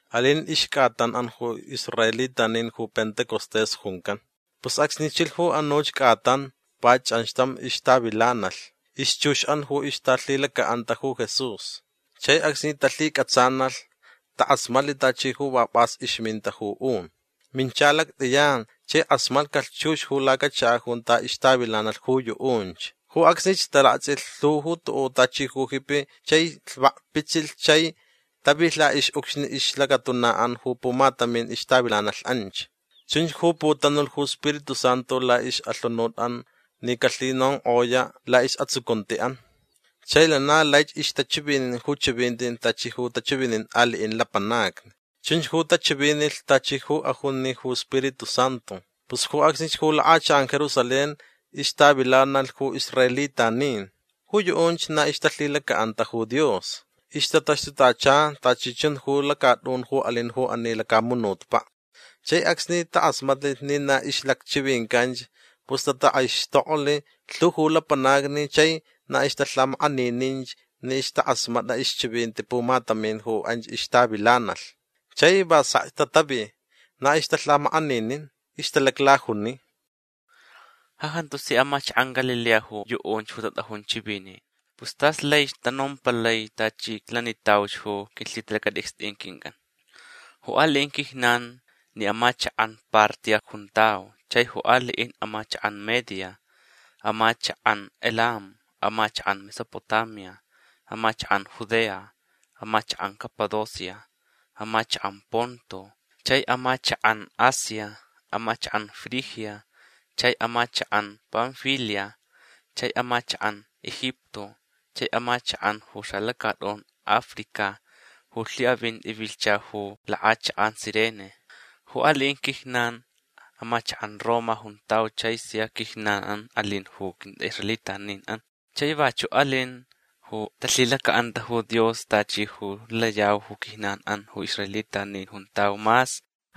Alin ixcʼatanʼan ju israelitanin ju Pentecostés juncan. Pus acsni chilh ju anuch cʼatan va chʼanxtam ixtavilanalh ixchuxʼan ju ixtalhilacaʼanta ju Jesús. Chai acsni talhicʼatsanalh takʼasmatlh tachi ju va pʼas ixminta ju un. Mincha lactʼiyan chai kʼasmatcalh chux ju lacachakaʼ junta ixtavilanalh ju yuʼunch. Ju acsnich talaktsʼilh lhu tuʼuʼ tachi ju jipi chai lhvakpitsilh chai tavilh laʼixʼucxni ixlacatunaʼan ju pumatamin ixtavilanalh anch. Chunch ju putanulh ju Spiritu Santu laʼixʼalhunutʼan ni calhinonkʼoyaʼ laʼisʼatsucuntiʼan. Chai lana laich ixtachivinin ju chivinti tachi ju tachivinin aliʼin lapanacni. Chunch ju tachivinilh tachi ju ajuni ju Spiritu Santu. Pus ju acsnich ju lakʼachakʼan Jerusalén ixtavilanalh ju israelitanin. Ju yuʼunch na ixtalhilacaʼanta ju Dios. Ixtataxtutacha tachi chun ju lacatʼun ju alin ju ani lacamunutpaʼ. Chai acsni takʼasmatlich ni na ixlacchivincanch pus tatakʼaixtoklh lhu ju lapanacni chai na ixtalhamakʼanininch ni ixtakʼasmatʼa ixchivinti pumatamin ju anch ixtavilanalh. Chai va sekch tatavi. Na ixtalhamakʼaninin. Ixtalaclajuni: ―Ja jantu si amachakʼan Galilea ju yuʼunch ju tatʼajun chivinin. Pus tas laich tanompalai tachi iclanitauch ju quilhitalactʼicstʼin quincʼan. Ju aliʼin quijnan ni amachakʼan Partia juntau chaich ju aliʼin amachakʼan Media, amachakʼan Elam, amachakʼan Mesopotamia, amachakʼan Judea, amachakʼan Capadocia, amachakʼan Ponto, chai amachakʼan Asia, amachakʼan Frigia chai amachakʼan Panfilia chai amachakʼan Egipto chai amachakʼan ju xalacatʼun Africa ju lhiʼavinti vilhcha ju lakʼachakʼan Cirene. Ju aliʼin quijnan amachakʼan Roma juntau chai sia quijnanʼan alin ju quintʼaʼisraelitaninʼan chaich vachuʼ alin ju talhilacaʼanta ju Dios tachi ju layau ju quijnanʼan ju israelitanin juntau mas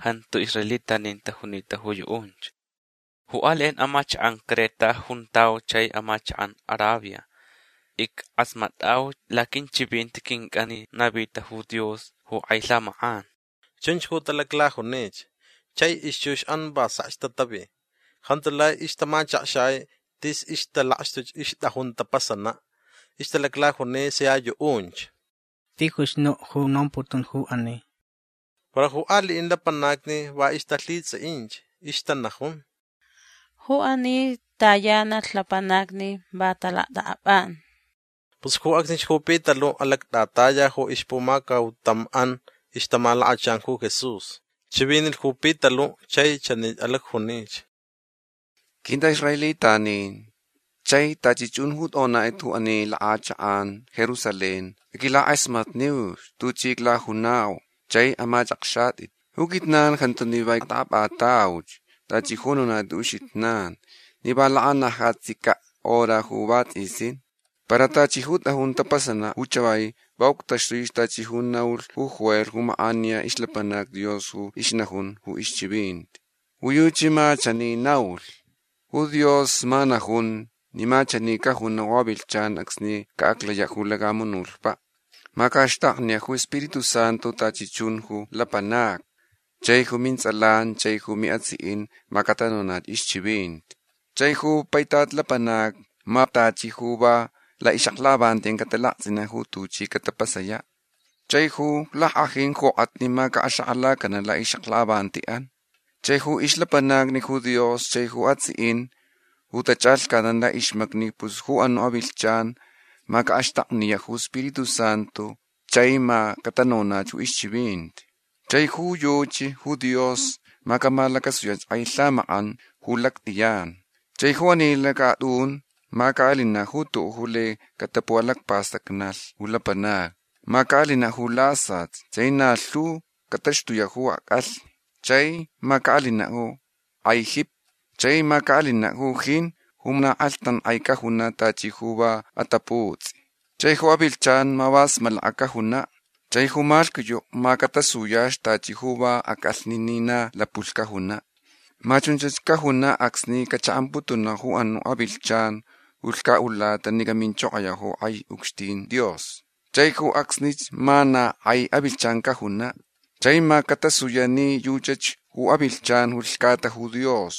jantu israelitanin tajunita ju yuʼunch. Ju aliʼin amachakʼan Creta juntau chai amachakʼan Arabia. Ickʼasmatʼauch laquinchivinti quincʼan ni navita ju Dios ju kʼai lhamakʼan. ―Chunch ju talaclajunich. Chai ixchuxʼan va sekch tatavi. Jantu lai ixtamachakxai tis ixtalakxtuch ixtʼajun tapasanaʼ. Ixtalaclajuni sia yuʼunch: ―Tijuch nuʼ ju nomputun ju ani. Para ju aliʼin lapanacni va ixtalhitsʼiʼinch. Ixtanajun: ―Ju ani tayanalh lapanacni va talactʼakʼapʼan. Pus ju acsnich ju Pitaluʼ alactʼataya ju ixpumacautamʼan ixtamalakachan ju Jesús. Chivinilh ju Pitaluʼ chai chani alacjunich: ―Quintʼaʼisraelitanin chai tachi chun ju tʼonatʼit ju ani lakʼachakʼan Jerusalén aquilakʼasmatniuch tuchi aclajunau chai amachʼakxatʼit. Ju quijnan jantu ni va ictʼakʼapʼatauch tachi ju nonatʼit ju uxijnan ni va lakanajatsicaʼ hora ju vatsʼisin. Para tachi ju tʼajun tapasanaʼ ju chavai va uctaxtui tachi ju naulh ju Joel ju makʼaniya ixlapanac Dios ju ixnajun ju ixchivinti. Ju yuchi ma chani naulh: Ju Dios ma najun ni ma chanich cajunaʼ ju avilhchan acsni caʼaclayach ju lacamunutpaʼ. Ma caʼaxtakniyaʼ ju iSpiritu Santu tachi chun ju lapanacni chai ju mintsʼalan chai ju miʼatsiʼin ma catanonach ixchivinti. Chaich ju paitat lapanacnich ma tachi ju va laʼixʼaklakʼavantiʼan catalaktsʼinaʼ ju tuchi catapasayaʼ. Chai ju lackʼajin jokʼatni ma caʼaxakʼalacanaʼ laʼixʼaklakʼavantiʼan. Chai ju ixlapanacni ju Dios chai ju atsiʼin ju tachʼalhcatnan laʼixmacni pus ju anuʼ avilhchan ma caʼaxtakniyaʼ ju iSpiritu Santu chai ma catanonach ju ixchivinti. Chai ju yuchi ju Dios ma camalacasuyach kʼai lhamakʼan ju lactʼiyan. Chai ju ani lacatʼun ma caʼalinaʼ ju tuʼuʼ ju lai catapuʼalacpastacnalh ju lapanacni. Ma caʼalinaʼ ju lasat chai na lhu cataxtuyaʼ ju acʼalhni. Chai ma caʼalinaʼ ju kʼai jipi. Chai ma caʼalinaʼ ju jin ju na kʼalhtankʼai cajunaʼ tachi ju va ataputsʼi. Chai ju avilhchan ma va smalaka cajunaʼ. Chai ju malhquiyuʼ ma catasuyach tachi ju va acʼalhni ni na lapulh cajunaʼ. Ma chunch cajunaʼ acsni cachaʼamputunach ju anuʼ avilhchan ju lhcaʼulata ni caminchokoyaʼ ju kʼai ucxtin Dios. Chai ju acsnich ma na kʼai avilhchan cajunaʼ. Chai ma catasuyaʼ ni yuchach ju avilhchan ju lhcata ju Dios.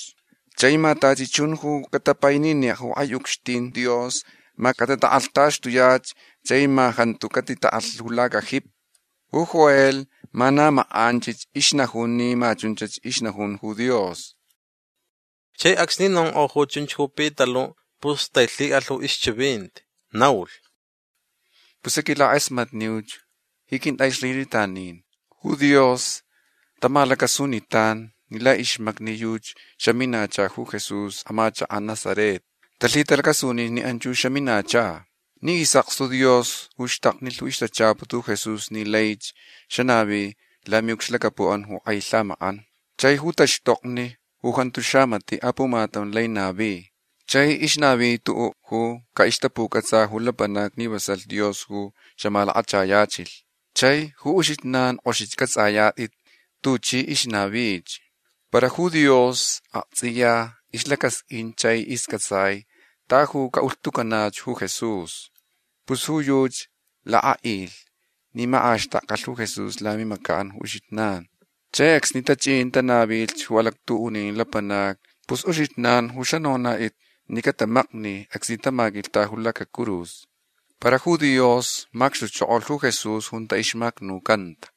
Chai ma tachi chun ju catapaininiyaʼ ju kʼai ucxtin Dios ma catatakʼalhtaxtuyach chai ma jantu catitaʼalh ju lacajipi. Ju Joel ma na makʼanch ixnajun ni ma chunch ixnajun ju Dios. Chai acsni nonkʼo ju chunch ju Pitaluʼ pus tailhiʼalh ju ixchivinti. Naulh: ―Pus aquilakʼasmatniuch ji quintʼaʼisraelitanin. Ju Dios tamalacasunitan ni laʼixmacni yuchi xaminacha ju Jesús amachakaʼ Nazaret. Talhitalacasuninch ni anch ju xaminacha ni isʼakstu Dios ju xtaknilh ixtachaput ju Jesús ni laich xanavi lamiʼucxlacapuʼan ju kʼai lhamakʼan chai ju taxtokni ju jantu xamatiʼ apumatam lai navi chai ixnavi tuʼuʼ ju caʼixtapucʼatsa ju lapanacni ni vasalh Dios ju xamalakachayachilh. Chai ju uxijnan kʼoxich cʼatsʼayatʼit tuchi ixnavich. Para ju Dios aktsʼiya ixlacasqʼuin chai iscʼatsai ta yu caʼulhtucanaʼ ju Jesús. Pus ju yuchi lakʼaʼilh ni makʼaxtakcalh ju Jesús lamimacaʼan ju uxijnan. Chai acsni tachʼin tanavilh ju alactuʼunin lapanacni pus uxijnan ju xanonatʼit ni catamakni acsni tamaquilhta ju lacacurus. Para ju Dios macxtuchokolh ju Jesús junta ixmacnucanta.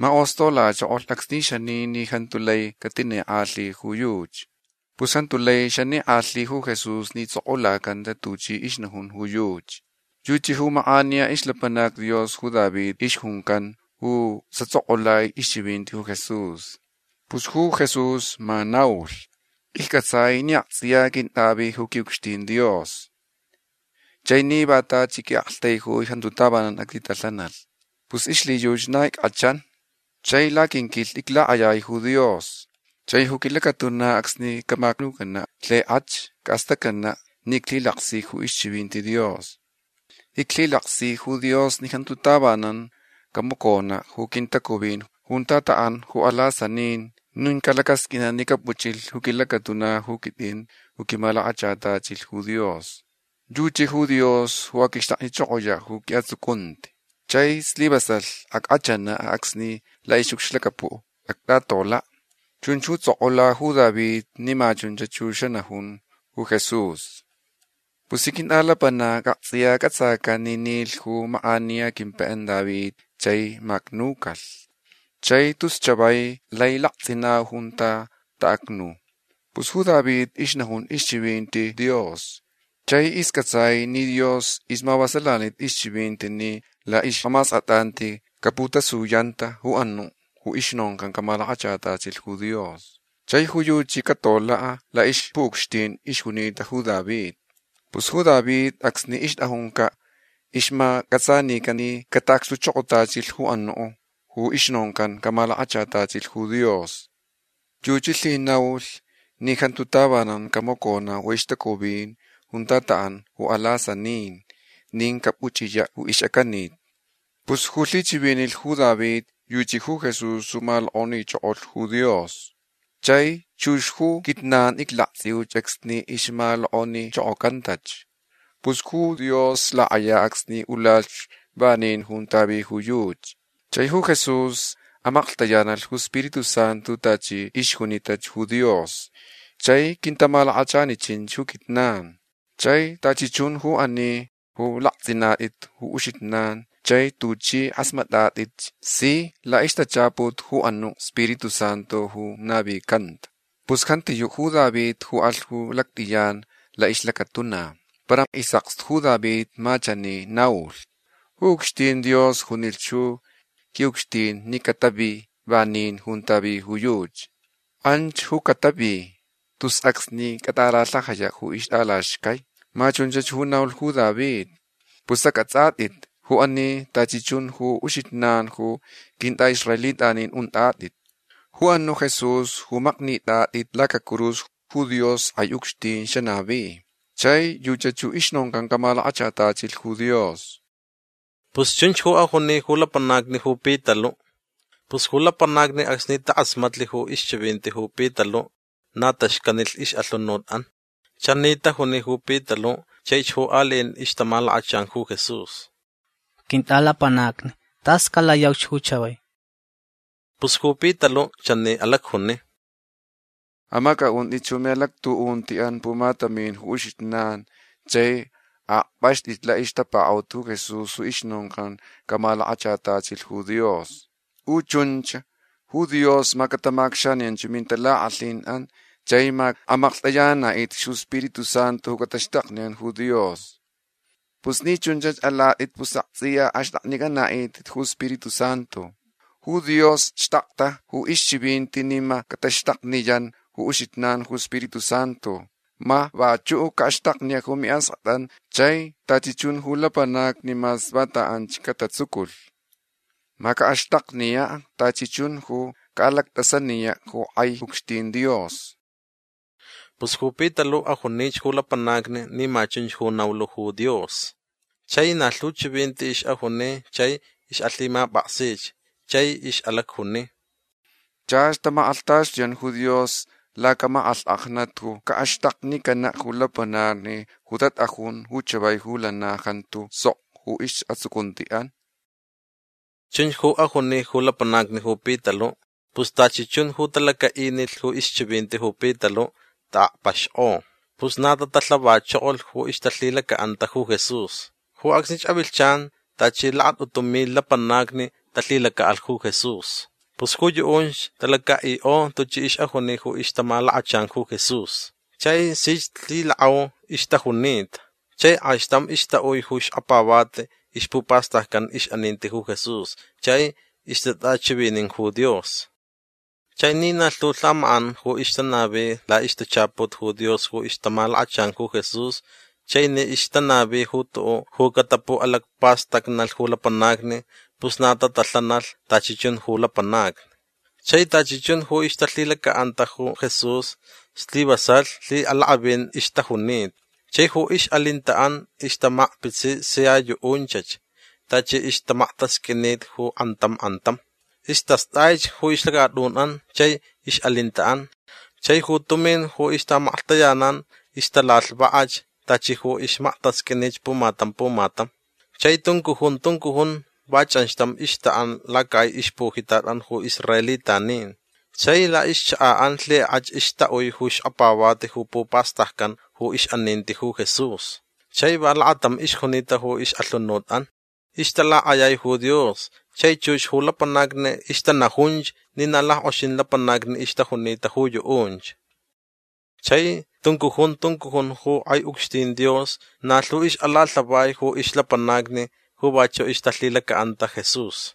Makʼostolachokolh acsni xani ni jantu lai catinikʼalhi ju yuchi. Pus jantu lai xanikʼalhi ju Jesús ni tsʼokʼulacanta tuchi ixnajun ju yuchi. Yuchi ju makʼaniya ixlapanac Dios ju David ixjuncan ju xatsʼokʼulai ixchivinti ju Jesús. Pus ju Jesús ma naulh: Iccʼatsai ni aktsʼiya quintʼavi ju quiʼucxtin Dios. Chai ni va tachi quiʼaktaijui pus jantu tavanan actitalhanalh. Pus ixlhiyuchi na ickʼachan. Chai laquinquilhni iclakʼayai ju Dios. Chai ju quilacatuna acsni camacnucanaʼ lhikʼach caʼastacnanaʼ ni iclhilaksich ju ixchivinti Dios. Iclhilaksi ju Dios ni jantu tavanan camaconaʼ ju quintacuvin junta taʼan ju alasanin nin calacʼasqʼuinaʼ ni capuchʼilh ju quilacatuna ju quitʼin ju quimalakachatachilh ju Dios. Yuchi ju Dios ju aquixtaknichokoyaʼ ju quiʼatsucunti. Chai slivasalh ackʼachanaʼ acsni laʼixʼucxlacapuʼ actʼatolaʼ. Chunch ju tsʼokʼula ju David ni ma chunch ju xanajun ju Jesús. Pus ji quintʼalapanacni aktsʼiya cʼatsacan ni nilh ju makʼaniya quimpaiʼan David chai macnucalh. Chai tus chavai lai laktsʼinau junta taʼacnu. Pus ju David ixnajun ixchivinti Dios chai iscʼatsaich ni Dios ixmavasalanita ixchivinti ni laʼixʼamaskʼatʼanti caputasuyanta ju anuʼ ju ixnoncan camalakachatachilh ju Dios. Chai ju yuchi catolaʼ laʼixpuʼucxtin ixjunita ju David. Pus ju David acsni ixtʼajuncaʼ ixmacʼatsanican ni cataʼacxtuchokotachilh ju anuʼ ju ixnoncan camalakachatachilh ju Dios. Yuchi lhinaulh ni jantu tavanan camaconaʼ ju ixtacuvin junta taʼan ju alasanin nin capuchʼiyaʼ ju ixʼacanit. Pus ju lhichivinilh ju David yuchi ju Jesús ju malokʼonichokolh ju Dios. Chai chux ju quijnan iclaktsʼiuch acsni ixmalokʼonichokocantach. Pus ju Dios lakʼaya acsni ulalh vanin junta vi yuchi. Chai ju Jesús amaklhtayanalh ju Spiritu Santu tachi ixjunitach ju Dios. Chai quintamalakachanichin ju quijnan. Chai tachi chun ju ani ju laktsʼinatʼit ju uxijnan chai tuchʼi kʼasmatʼatʼit si laʼixtachaput ju anuʼ Spiritu Santu ju navicanta. Pus jantiyuʼ ju David ju alh ju lactʼiyan laʼixlacatuna. Para isʼakstu ju David ma chani naulh: Ju ucxtin Dios junilh ju quiʼucxtin ni catavi vanin junta vi ju yuchi. Anch ju catavi tus acsni catʼalalhajayaʼ ju ixtʼalaxcai. Ma chunch ju naulh ju David. Pus acʼatsʼatʼit ju ani tachi chun ju uxijnan ju quintʼaʼisraelitanin untʼatʼit. Ju anuʼ Jesús ju maknitʼatʼit lacacurus ju Dios kʼai ucxtin xanavi. Chai yuchach ju ixnoncan camalakachatachilh ju Dios. ―Pus chunch ju ajuni ju lapanacni ju Pitaluʼ. Pus ju lapanacni acsni takʼasmatlh ju ixchivinti ju Pitaluʼ na xcanilh ixʼalhunutʼan. Chani tajuni ju Pitaluʼ chaich ju aliʼin ixtamalakachan ju Jesús: ―Quintʼalapanacni tas calayauch ju chavai. Pus ju Pitaluʼ chani alacjuni: ―Amacʼaʼuntʼit ju miʼalactuʼuntiʼan pumatamin ju uxijnan chai aʼakpʼaxtʼit laʼixtapakaʼut ju Jesús ju ixnoncan camalakachatachilh ju Dios. Ju chunch ju Dios ma catamacʼacxaniyan ju mintalakʼalhinʼan chai ma amaklhtʼayananaʼitʼit ju Spiritu Santu ju cataxtakniyan ju Dios. Pus ni chunch alatʼit pus aktsʼiya axtʼaknicʼanaʼitʼit ju Spiritu Santu. Ju Dios xtakta ju ixchivinti ni ma cataxtakniyan ju uxijnan ju Spiritu Santu. Ma vachuʼ caʼaxtakniyaʼ ju miʼaskʼatʼan chai tachi chun ju lapanacni mas vanta anchach catatsuculh. Ma caʼaxtakniyaʼ tachi chun ju caʼalactʼasaniyaʼ ju kʼai ucxtin Dios. ―Pus ju Pitaluʼ ajunich ju lapanacni ni ma chunch ju naulh ju Dios. Chai na lhu chivinti ixʼajuni chai ixʼalhimapʼaksich. Chai ixʼalacjuni: ―Chach tamakʼalhtaxtuyan ju Dios lacamakʼalhkʼajnat ju caʼaxtaknicanaʼ ju lapanacni ju tatʼajun ju chavai ju lana jantu sok ju isʼatsucuntiʼan. ―Chunch ju ajuni ju lapanacni ju Pitaluʼ. Pus tachi chun ju talacaʼinilh ju ixchivinti ju Pitaluʼ taʼakpaxkʼo. Pus na tatalhavachokolh ju ixtalhilacaʼanta ju Jesús. Ju acsnich avilhchan tachi lakatʼutu milh lapanacni talhilacaʼalh ju Jesús. Pus ju yuʼunch talacaʼikʼo tuchi ixʼajuni ju ixtamalakachan ju Jesús. Chai sich lhilakʼau ixtajunita. Chai kʼaixtam ixtaʼui ju xkapavati ixpupastaccan ixʼaninti ju Jesús. Chai ixtatʼachivinin ju Dios. Chai ni na lhu lhamakʼan ju ixtanavi laʼixtachaput ju Dios ju ixtamalakachan ju Jesús chai ni ixtanavi ju tuʼuʼ ju catapuʼalacpastacnalh ju lapanacni pus na tatalhanalh tachi chun ju lapanacni. Chai tachi chun ju ixtalhilacaʼanta ju Jesús slivasalh lhiʼalakʼavin ixtajunita. Chai ju ixʼalintaʼan ixtamakpitsi sia yuʼunchach tachi ixmaktasqʼuini ju kʼantam kʼantam. Istastʼaich ju ixlacatʼunʼan chai ixʼalintaʼan. Chai ju tumin ju ixtaʼamaklhtayanan ixtalalhvakʼach tachi ju ixmaktasqʼuinich pumatam pumatam. Chai tuncujun tuncujun va chʼanxtam ixtaʼan lacakʼai ixpujitatʼan ju israelitanin. Chai laʼixchakaʼan lhikʼach ixtaʼui ju xkapavati ju pupastaccan ju ixʼaninti ju Jesús. Chai va lakatam ixjunita ixʼalhunutʼan. Ixtalakʼayai ju Dios chai chux ju lapanacni ixtanajunch ni na lackʼoxin lapanacni ixtajunita ju yuʼunch. Chai tuncujun tuncujun ju kʼai ucxtin Dios na lhu ixʼalalhavai ju ixlapanacni ju vachuʼ ixtalhilacaʼanta Jesús.